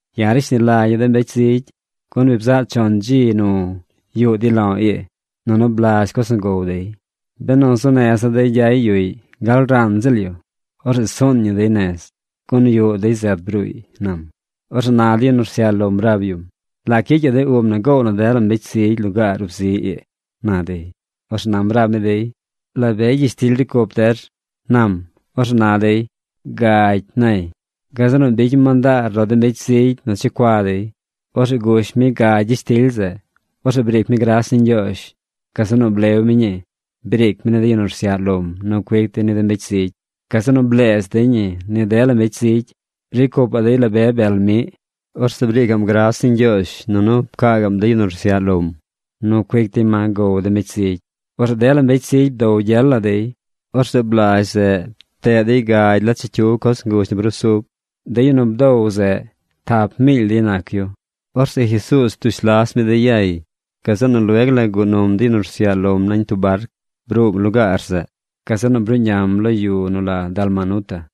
―Ya̱ rashni lagya̱ de mbecy zigy, gun bi bzaꞌ chon dzi nu yuꞌ dey lo̱ ii, nunu blazh coz nu gow dey. Benu zuu neza̱ dey gyay yuꞌy gal ran ziꞌl yu, orzeꞌ suun ñi dey nez, gun yuꞌ dey zet bruuy ―nam. Orzeꞌ na de yu nu rsyaꞌ lom rab yum: ―¿Lac gyicyaꞌ de ub na goow na dela mbecy zigy lugaar ub zi ii? ―na dey. Orzeꞌ nam rab mi dey: ―¿La be gyishtily ricy cup der? ―nam. Orzeꞌ na dey: ―Gagy ―nay. Gazeꞌ nu bicy mi mandaar lo de mbecy zigy nu checua dey. Orzeꞌ gush mi gagy gyishtily zeꞌ. Orzeꞌ briic mi gras ni Ñgyoozh. Gazeꞌ nu blew mi ñii. Briic mi ni de yu nu rsyaꞌ lom nu cuic dey ni de mbecy zigy. Gazeꞌ nu bleez dey ñi ni dela mbecy zigy. Ricy cupaꞌ dey la be bel miꞌ. Orzeꞌ briicaꞌm gras ni Ñgyoozh nunu pcaa gaꞌm de yu nu rsyaꞌ lom nu cuic dey ma gow de mbecy zigy. Orzeꞌ dela mbecy zigy bdow gyel la dey. Orzeꞌ blazh zeꞌ, pteꞌ dey gagy la chicyiw coz nguzh nu brusub. De yu nu bdow zeꞌ, tap miily dey nac yu. Orzeꞌ Jesuuz ptush las mi dey yay. Gazeꞌ nu lueg la guꞌ num de yu nu rsyaꞌ lom nañ tub barc. Bruum lugaar zeꞌ. Gazeꞌ nu bruꞌñam lo yu nu la Dalmanuta.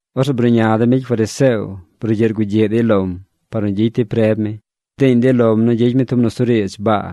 Orzeꞌ bruꞌña de mbecy fariseo brugyiꞌ rgugyiꞌ dey lom par nu gyicy dey preb mi. Bdiiñ dey lom nu gyicy mi tub nusuriidz baa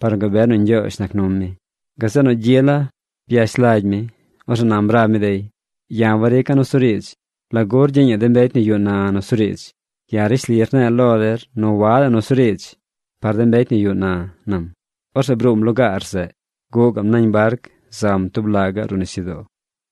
par nu gabe nu Ñgyoozh nac num mi. Gazeꞌ nu gyi la byash lagy mi. Orzeꞌ nam rab mi dey: ―Ya̱ warica̱ nusuriidz. ¿Lagu rgyiiñaꞌ de mbecy nu yuꞌ na nusuriidz? Ya̱ rishli rne̱e̱ lo der nu wadaꞌ nusuriidz par de mbecy nu yuꞌ na ―nam. Orzeꞌ bruum lugaar zeꞌ. Guꞌ gaꞌm nañ barc zam tub laꞌ gaꞌ ruꞌ nisyudoo.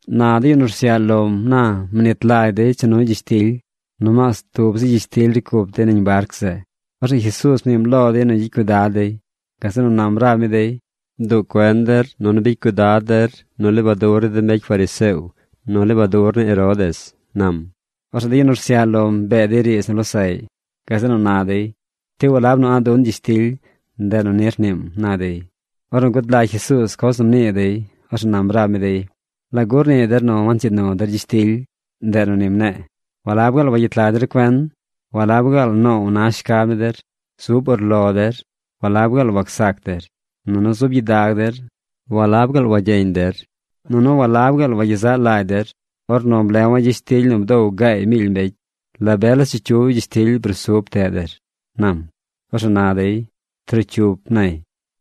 Na de yu nu rsyaꞌ lom na mnit lagy dey cha nuy gyishtily. Nomaas tub zi gyishtily ricy cup dey nañ barc zeꞌ. Orzeꞌ Jesuuz mniim lo dey nu gyicy cuidad dey. Gazeꞌ nu nam rab mi dey: ―Bduꞌ cuen der nunu bicy cuidad der nu lebadur ni de mbecy fariseo nu lebadur ni Herodes ―nam. Orzeꞌ de yu nu rsyaꞌ lom bee dey riidz nu losaꞌy. Gazeꞌ nu na dey: ―¿Ti walab nu a̱ꞌ dun gyishtily, ndeꞌ nu ni rniim? ―na dey. Ornu gud lagy Jesuuz coz nu mnii dey, orzeꞌ nam rab mi dey: ―¿Lagu rnii der nu wancyiid nu der gyishtily, ndeꞌ nu ni mne̱e̱? ¿Walab gaal wagyet lag der cuen? ¿Walab gaal noow na shcab ni der? Zub urlo der, ¿walab gaal wacsac der? Nunu zub gyidag der ¿walab gaal wagyeñ der? Nunu ¿walab gaal wagyezaꞌ lagy der? Ornu blewa̱ gyishtily nu bdow gaay miily mbecy, ¿la be la chicyiw gyishtily nu brusub pteꞌ der? ―nam. Orzeꞌ na dey: ―Trocyup ―nay.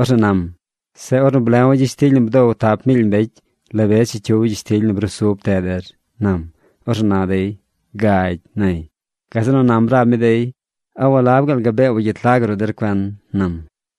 Orzeꞌ nam: ―Zeꞌ ornu blewa̱ gyishtily nu bdow tap miily mbecy, ¿la be chicyiw gyishtily nu brusub pteꞌ der? ―nam. Orzeꞌ na dey: ―Gagy ―nay. Gazeꞌ nu nam rab mi dey: ―¿A walab gaal gabee wagyet lag ruꞌ der cuen? ―nam.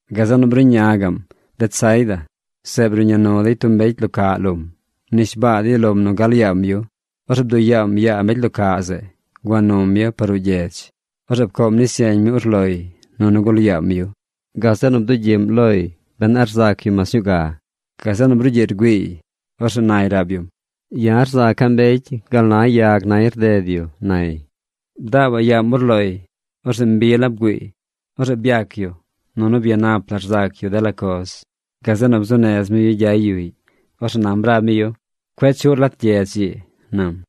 Gazeꞌ nu bruꞌñam Betsaida. Zeꞌ bruꞌña nu dey tub mbecy lo caꞌ lom. Mnishbaa dey lom nu gal yaam yu. Orzeꞌ bduꞌ yaam yaa mbecy lo caꞌ zeꞌ. Gua num yu par ruꞌ gyedz. Orzeꞌ pcoom nis yeñ mi urloy nunu gul yaam yu. Gazeꞌ nu bdugyiꞌm loy ben a rzac yu mas ñuu ga. Gazeꞌ nu brugyiꞌ rgüiiy. Orzeꞌ nay rab yum: ―Ya̱ rzaca̱ mbecy gal na yag nay rded yu ―nay. Bdaabaꞌ yaam urloy. Orzeꞌ mbi la bgüiiy. Orzeꞌ byac yu nunu byanap la rzac yu dela coz. Gazeꞌ nu bzuu nez mi yu gyay yuꞌy. Orzeꞌ nam rab mi yu: ―Cueꞌ chuꞌr lat gyedz ii ―nam.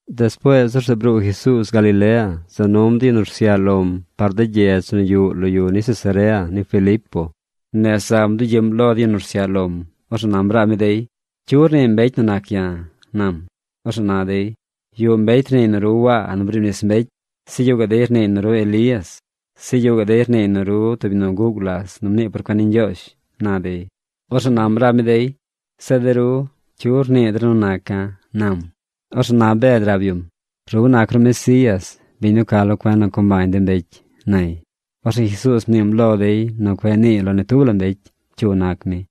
Despuees orzeꞌ bruu Jesuuz Galilea za num de yu nu rsyaꞌ lom par de gyedz nu yuꞌ lo yu ni Cesarea ni Filipo. Nez zam bdugyiꞌm lo de yu nu rsyaꞌ lom. Orzeꞌ nam rab mi dey: ―¿Cyu rnii mbecy nu nac ya̱? ―nam. Orzeꞌ na dey: ―Yuꞌ mbecy rniiy nu ru Waa nu briib nis mbecy. Zeꞌ yuꞌ gaꞌ dey rniiy nu ru Elías. Zeꞌ yuꞌ gaꞌ dey rniiy nu ru tub yu nu guꞌ gulas nu mnii por cuen ni Ñgyoozh ―na dey. Orzeꞌ nam rab mi dey: ―Zeꞌ de ru, ¿cyu rnii der nu naca̱? ―nam. Orzeꞌ na Bed rab yum: ―Ru nac ru Mesías, biñ nu ca lo cuen nu co mbañ de mbecy ―nay. Orzeꞌ Jesuuz mniim lo dey nu cueꞌ niiy lo ni tub la mbecy cyu nac mi.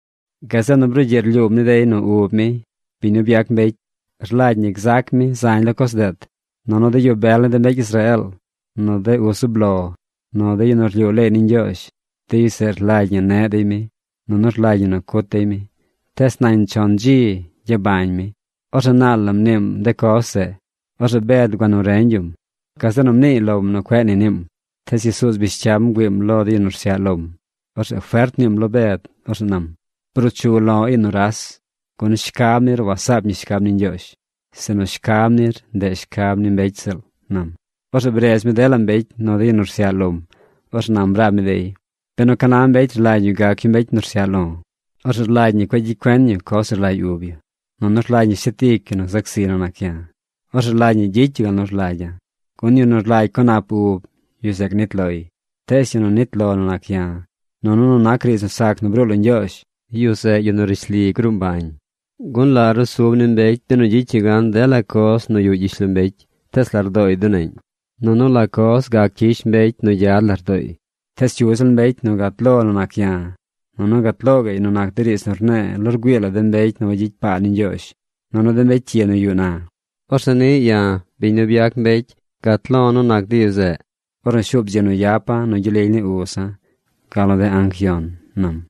Gazeꞌ nu brugyiꞌ rlyuum ni dey nu ub mi, biñ nu byac mbecy, rlagy ñi gzac mi zañ lo coz deet. Nunu de yu bel ni de mbecy Israeel, nu de uz zub lo, nu de yu nu rlyuu leey ni Ñgyoozh, de yu zeꞌ rlagy ñi neꞌ dey mi. Nunu rlagy ñi nu cut dey mi. Tees nañ chon dzi gyabañ mi. Orzeꞌ naal la mniim de coz zeꞌ. Orzeꞌ Bed gua nu reñ yum. Gazeꞌ nu mniiy lom nu cueꞌ ni niim. Tees Jesuuz bish cyam bgüiim lo de yu nu rsyaꞌ lom. Orzeꞌ fert mniim lo Bed. Orzeꞌ nam: ―¡Bruu chu lo̱ ii nuras! Gun shcab nir wasaap ñi shcab ni Ñgyoozh, sinu shcab nir, ndeꞌ shcab ni mbecy ziꞌl ―nam. Orzeꞌ bredz mi dela mbecy nu de yu nu rsyaꞌ lom. Orzeꞌ nam rab mi dey: ―Benu ca na mbecy rlagy yu gac yu mbecy nu rsyaꞌ lo, orzeꞌ rlagy ñi cueꞌ gyicy cuen yu coz nu rlagy ub yu. Nunu rlagy ñi shet ic yu nu gzac ziy nu nac ya̱. Orzeꞌ rlagy ñi gyicy yu gal nu rlagya̱. Gun yu nu rlagy co nap ub, yu zeꞌ gnit loy. Tees yu nu nit lo nu nac ya̱, nunu nu nac riidz nu sac nu bruu lo Ñgyoozh, yu zeꞌ yu nu rishli gruu mbañ. Gun ¿la rusub ni mbecy benu gyicy yu gan dela coz nu yuꞌ gyishlombecy tees lardooy duneꞌñ? Nunu ¿la coz gac cyish mbecy nu gyad lardooy? Tees cyu ziꞌl mbecy nu gat lo nu nac ya̱ nunu gat lo gaꞌy nu nac de riidz nu rne̱e̱ lo rgüii la mbecy nu wagyicy paa ni Ñgyoozh nunu de mbecy cyi nu yuꞌ na, orzeꞌ niꞌ ya̱, biñ nu byac mbecy, gat lo̱ nu nac de yu zeꞌ ornu shuub dzi nu yapa̱ nu gyel lily ni uza̱ gal nu de anc yon ―nam.